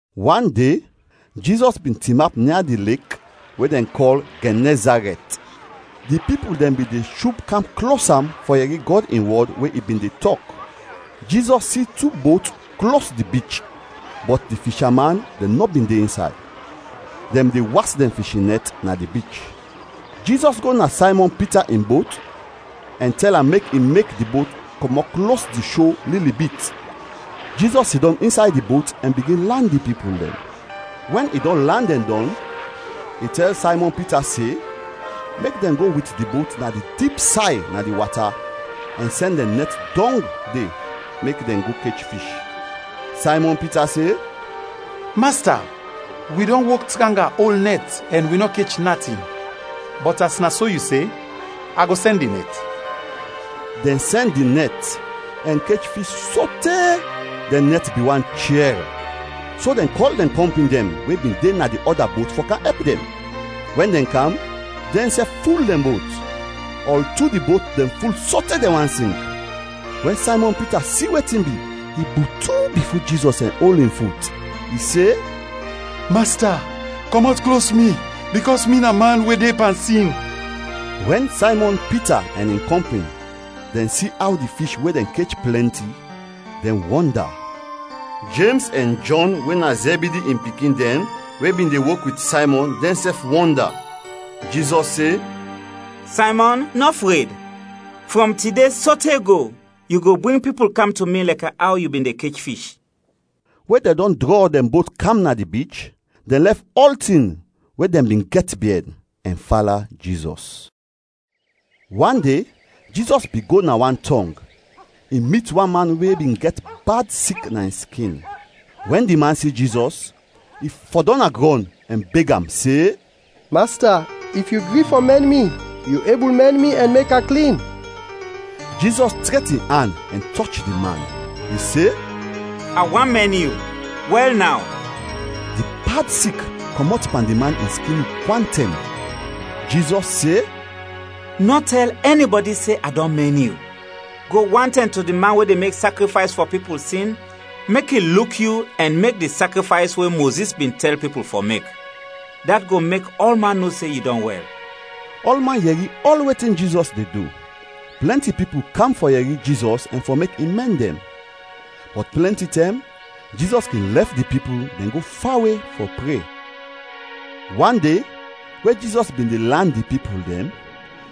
Wan de, Jizɔs bin tinap nia di lek we dɛn kɔl Gɛnɛzarɛt. Di pipul dɛn bin de shub kam klos am fɔ yɛri Gɔd in wɔd we i bin de tɔk. Jizɔs si tu bot klos di bich, bɔt di fisha man dɛn nɔ bin de insay, dɛn bin de was dɛn fishin nɛt na di bich. Jizɔs go na Saymɔn Pita in bot ɛn tɛl am mek i mek di bot kɔmɔt klos di sho lili bit. Jizɔs sidɔm insay di bot ɛn bigin lan di pipul dɛn. Wɛn i dɔn lan dɛn dɔn, i tɛl Saymɔn Pita se, mek dɛn go wit di bot na di dip say na di wata ɛn sɛn dɛn nɛt dɔng de mek dɛn go kech fish. Saymɔn Pita se, “Masta, wi dɔn wok tranga ol nɛt ɛn wi nɔ kech natin, bɔt as na so yu se, a go sɛn di nɛt.” Dɛn sɛn di nɛt ɛn kech fish sote dɛn nɛt bin want chɛr, so dɛn kɔl dɛn kɔmpin dɛn we bin de na di ɔda bot fɔ kam ɛp dɛn. Wɛn dɛn kam, dɛnsɛf ful dɛn bot. Ɔl tu di bot dɛn ful sote dɛn want sink. Wɛn Saymɔn Pita si wetin bi, i butu bifo Jizɔs ɛn ol in fut. I se, “Masta, kɔmɔt klos mi bikɔs mi na man we de pan sin!” Wɛn Saymɔn Pita ɛn in kɔmpin dɛn si aw di fish we dɛn kech plɛnti, dɛn wɔnda. Jems ɛn Jɔn we na Zɛbidi in pikin dɛn we bin de wok wit Saymɔn, dɛnsɛf wɔnda. Jizɔs se, “Saymɔn, nɔ fred! Frɔm tide sote go, yu go bring pipul kam to mi lɛkɛ aw yu bin de kech fish.” We dɛn dɔn drɔ dɛn bot kam na di bich, dɛn lɛf ɔltin we dɛn bin gɛt biɛn, ɛn fala Jizɔs. Wan de, Jizɔs bin go na wan tɔng; i mit wan man we bin gɛt bad sik na in skin. Wɛn di man si Jizɔs, i fɔdɔm na grɔn ɛn beg am se, “Masta, if yu gri fɔ mɛn mi, yu ebul mɛn mi ɛn mek a klin.” Jizɔs tret in an ɛn tɔch di man. I se, “A want mɛn yu. Wɛl naw!” Di bad sik kɔmɔt pan di man in skin wantɛm. Jizɔs se, “Nɔ tɛl ɛnibɔdi se a dɔn mɛn yu! Go wantɛm to di man we de mek sakrifays fɔ pipul sin mek i luk yu ɛn mek di sakrifays we Mozis bin tɛl pipul fɔ mek. Dat go mek ɔlman no se yu dɔn wɛl.” Ɔlman yɛri ɔl wetin Jizɔs de du. Plɛnti pipul kam fɔ yɛri Jizɔs ɛn fɔ mek i mɛn dɛn. Bɔt plɛnti tɛm Jizɔs kin lɛf di pipul dɛn go fawe fɔ pre. Wan de we Jizɔs bin de lan di pipul dɛn,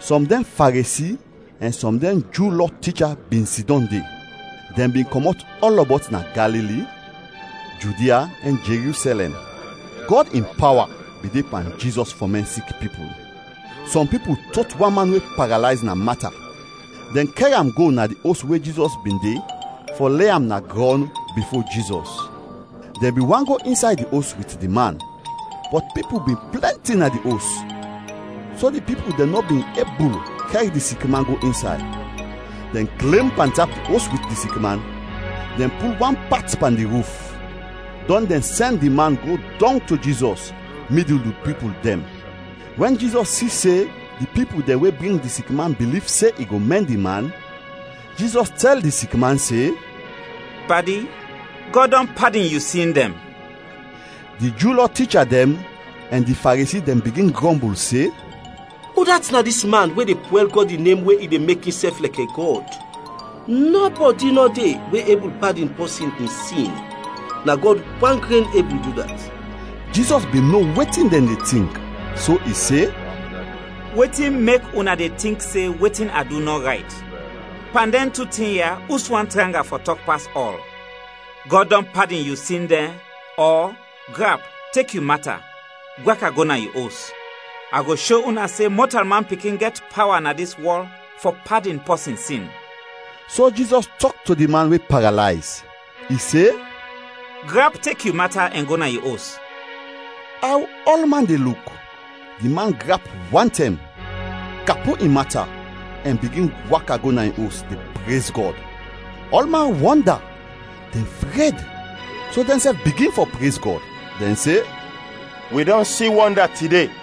sɔm dɛn Faresi ɛn sɔm dɛn Ju Lɔ ticha bin sidɔm de; dɛn bin kɔmɔt ɔlɔbɔt na Galili, Judia, ɛn Jerusɛlɛm. Gɔd in pawa bin de pan Jizɔs fɔ mɛn sik pipul. Sɔm pipul tot wan man we paralayz na mata. Dɛn kɛr am go na di os we Jizɔs bin de fɔ le am na grɔn bifo Jizɔs. Dɛn bin want go insay di os wit di man, bɔt pipul bin plɛnti na di os, so di pipul dɛn nɔ bin ebul kɛr di sik man go insay. Dɛn klem pantap di os wit di sik man. Dɛn pul wan pat pan di ruf, dɔn dɛn sɛn di man go dɔng to Jizɔs midul di pipul dɛn. Wɛn Jizɔs si se di pipul dɛn we bring di sik man biliv se in go mɛn di man, Jizɔs tɛl di sik man se, “Padi, Gɔd dɔn padin yu sin dɛn.” Di Ju Lɔ ticha dɛn ɛn di Faresi dɛn bigin grɔmbul se, “Udat na dis man we de pwɛl Gɔd in nem we i de mek insɛf lɛkɛ Gɔd? Nɔbɔdi nɔ de we ebul padin pɔsin in sin; na Gɔd wan gren ebul du dat!” Jizɔs bin no wetin dɛn de tink, so i se, “Wetin mek una de tink se wetin a du nɔ rayt? Pan dɛn tu tin ya, uswan tranga fɔ tɔk pas ɔl, ‘Gɔd dɔn padin yu sin dɛn,’ ɔ ‘Grap, tek yu mata, waka go na yu os?’ A go sho una se Mɔtalman Pikin gɛt pawa na dis wɔl fɔ padin pɔsin sin.” So Jizɔs tɔk to di man we paralayz. I se, “Grap, tek yu mata ɛn go na yu os.” Aw ɔlman de luk, di man grap wantɛm, kapu in mata ɛn bigin waka go na in os, de prez Gɔd. Ɔlman wɔnda, dɛn fred, so dɛnsɛf bigin fɔ prez Gɔd. Dɛn se, “Wi dɔn si wɔnda tide!”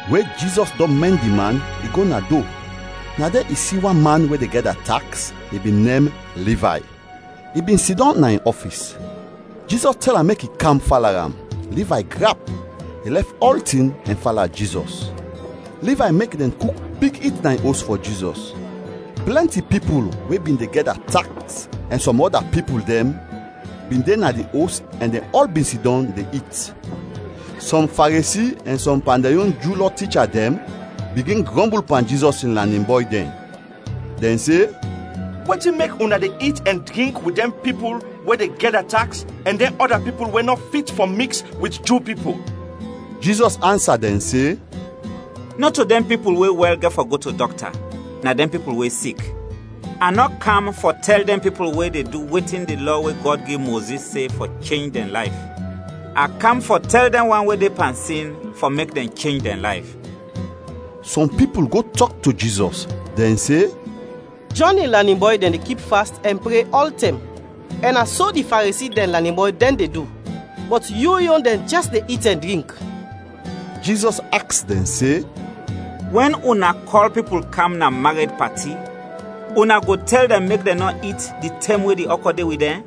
We Jizɔs dɔn mɛn di man, i go na do. Na de i si wan man we de gɛda taks; i bin nem Livay. I bin sidɔm na in ɔfis. Jizɔs tɛl am mek i kam fala am. Livay grap, i lɛf ɔltin ɛn fala Jizɔs. Livay mek dɛn kuk big it na in os fɔ Jizɔs. Plɛnti pipul we bin de gɛda taks ɛn sɔm ɔda pipul dɛn bin de na di os ɛn dɛn ɔl bin sidɔm de it. Sɔm Faresi ɛn sɔm pan dɛn yon Ju Lɔ ticha dɛn bigin grɔmbul pan Jizɔs in lanin bɔy dɛn. Dɛn se, “Wetin mek una de it ɛn drink wit dɛn pipul we de gɛda taks ɛn dɛn ɔda pipul we nɔ fit fɔ miks wit Ju pipul?” Jizɔs ansa dɛn se, “Nɔto dɛn pipul we wɛl gɛt fɔ go to dɔkta, na dɛn pipul we sik. A nɔ kam fɔ tɛl dɛn pipul we de du wetin di Lɔ we Gɔd gi Mozis se fɔ chenj dɛn layf, a kam fɔ tɛl dɛn wan we de pan sin fɔ mek dɛn chenj dɛn layf.” Sɔm pipul go tɔk to Jizɔs. Dɛn se, “Jɔn in lanin bɔy dɛn de kip fast ɛn pre ɔltɛm, ɛn na so di Faresi dɛn lanin bɔy dɛn de du, bɔt yu yon dɛn jɛs de it ɛn drink.” Jizɔs aks dɛn se, “Wɛn una kɔl pipul kam na mared pati, una go tɛl dɛn mek dɛn nɔ it di tɛm we di ɔkɔ de wit dɛn?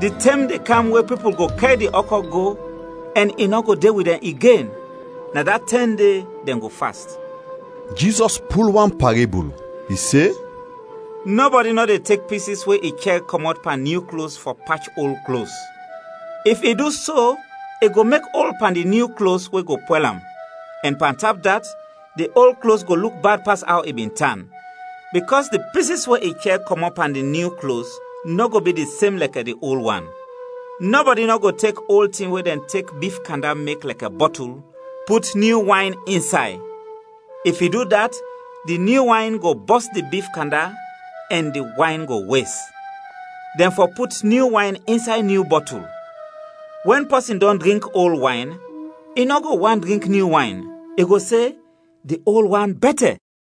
Di tɛm de kam we pipul go kɛr di ɔkɔ go ɛn i nɔ go de wit dɛn igen; na da tɛm de dɛn go fast.” Jizɔs pul wan parebul. I se: “Nɔbɔdi nɔ de tek pisis we i chɛr kɔmɔt pan nyu klos fɔ pach ol klos; if i du so, i go mek ol pan di nyu klos we go pwɛl am, ɛn pantap dat, di ol klos go luk bad pas aw i bin tan, bikɔs di pisis we i chɛr kɔmɔt pan di nyu klos nɔ go bi di sem lɛkɛ di ol wan. Nɔbɔdi nɔ go tek ol tin we dɛn tek bif kanda mek lɛkɛ bɔtul, put nyu wayn insay, if i du dat, di nyu wayn go bɔs di bif kanda ɛn di wayn go wes. Dɛn fɔ put nyu wayn insay nyu bɔtul. Wɛn pɔsin dɔn drink ol wayn, i nɔ go want drink nyu wayn. I go se, ‘Di ol wan bɛtɛ!’”